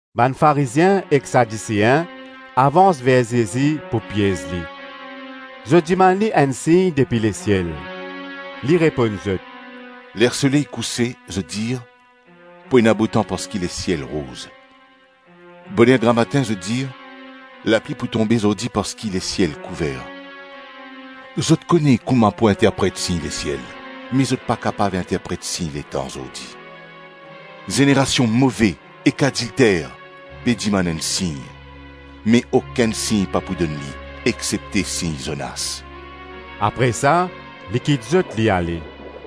Bann Farizien ek Sadisein avans ver Zezi pou piez li. Zot dimann li enn sign depi lesiel. Li reponn zot, “Ler soley kouse, zot dir, ‘Pou ena botan parski lesiel rouz.’ Boner gramatin zot dir, ‘Lapli pou tonbe zordi parski lesiel kouver.’ Zot kone kouma pou interpret sign lesiel, me zot pa kapav interpret sign letan zordi. Zenerasion move ek adilter pe dimann enn sign, me okenn sign pa pou donn li exsepte sign Zonas.” Apre sa li kit zot li ale.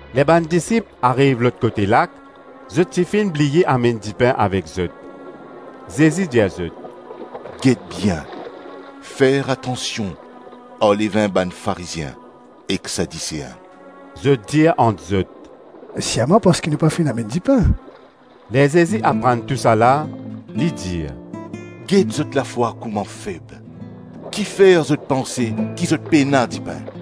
Ler bann disip ariv lot kote lak, zot ti finn bliye amenn dipin avek zot. Zezi dir zot, “Get bien, fer atansion ar levin bann Farizien ek Sadisein.” Zot dir ant zot, “Sirman parski nou pa finn amenn dipin.” Ler Zezi aprann tousala, li dir, “Get zot lafwa kouma feb, kifer zot panse ki zot pena dipin?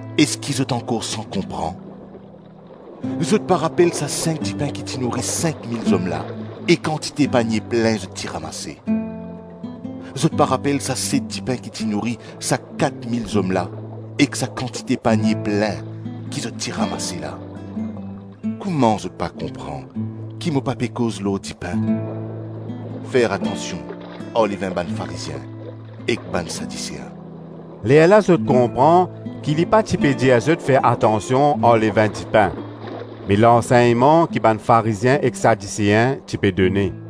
Eski zot ankor san konpran? Zot pa rapel sa sink dipin ki ti nouri sink mil zom la e kantite panie plin zot ti ramase? Zot pa rapel sa set dipin ki ti nouri sa kat mil zom la ek sa kantite panie plin ki zot ti ramase la? Kouma zot pa konpran ki mo pa pe koz lor dipin? Fer atansion ar levin bann Farizien ek bann Sadisein!” Lerla zot konpran ki li pa ti pe dir zot fer atansion ar levin dipin, me lansegnman ki bann Farizien ek Sadisein ti pe done.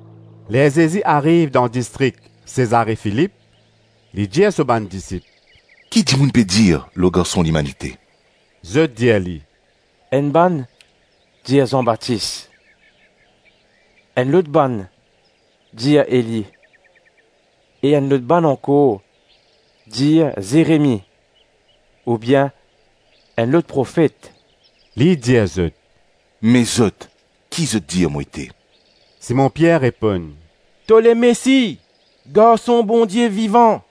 Ler Zezi ariv dan distrik Sezare-Filip, li dir so bann disip, “Ki dimoun pe dir lor Garson Limanite?” Zot dir li, “Enn bann dir Zan Batis, enn lot bann dir Eli e enn lot bann ankor dir Zeremi oubien enn lot profet.” Li dir zot, “Me zot, ki zot dir mo ete?” Simon Pier reponn, “To Lemesi, Garson Bondie Vivan.”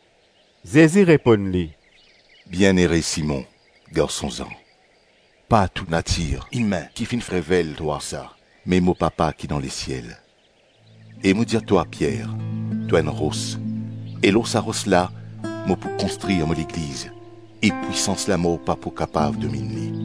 Zezi reponn li, “Bienere Simon, garson Zan! Pa to natir imin ki finn revel twa sa, me mo Papa ki dan lesiel. E mo dir twa Pier, to enn ros, e lor sa ros la mo pou konstrir mo Legliz, e pwisans lamor pa pou kapav dominn li.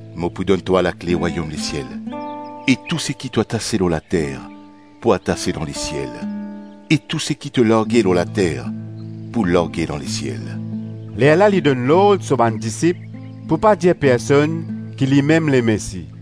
Mo pou donn twa lakle rwayom lesiel, e tou seki to atase lor later pou atase dan lesiel e tou seki to large lor later pou large dan lesiel.” Lerla li donn lord so bann disip pou pa dir personn ki limem Lemesi.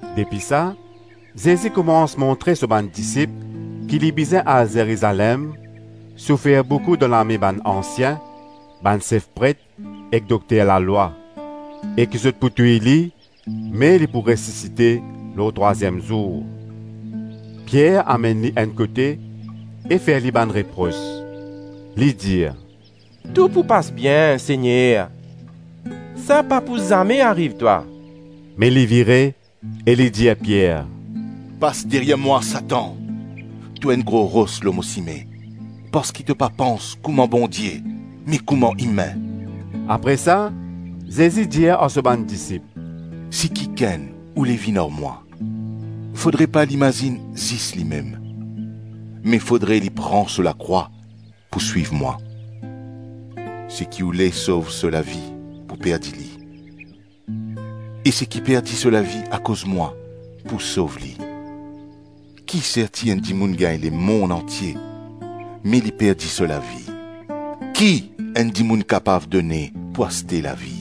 Depi sa, Zezi koumans montre so bann disip ki li bizin al Zerizalem, soufer boukou dan lame bann ansien, bann sef pret ek dokter lalwa e ki zot pou touy li me li pou resisite lor trwaziem zour. Pier amenn li enn kote e fer li bann repros; li dir, “Tou pou pas bien, Segner! Sa pa pou zame ariv twa.” Me li vire e li dir Pier, “Pas deryer mwa, Satan! To enn gro ros lor mo sime parski to pa pans kouma Bondie me kouma imin.” Apre sa Zezi dir ar so bann disip, “Si kikenn oule vinn ar mwa, fodre pa li mazinn zis limem, me fodre li pran so lakrwa pou swiv mwa. Seki oule sov so lavi pou perdi li, e seki perdi so lavi akoz mwa pou sov li. Ki serti enn dimoun gagn lemonn antie me li perdi so lavi? Ki enn dimoun kapav done pou aste lavi?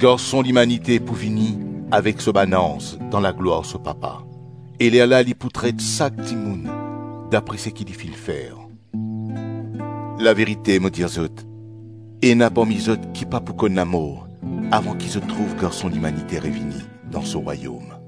Garson Limanite pou vini avek so bann anz dan laglwar so Papa, e lerla li pou tret sak dimoun dapre seki li finn fer. Laverite mo dir zot, ena parmi zot ki pa pou konn lamor avan ki zot trouv Garson Limanite revini dan so Rwayom.”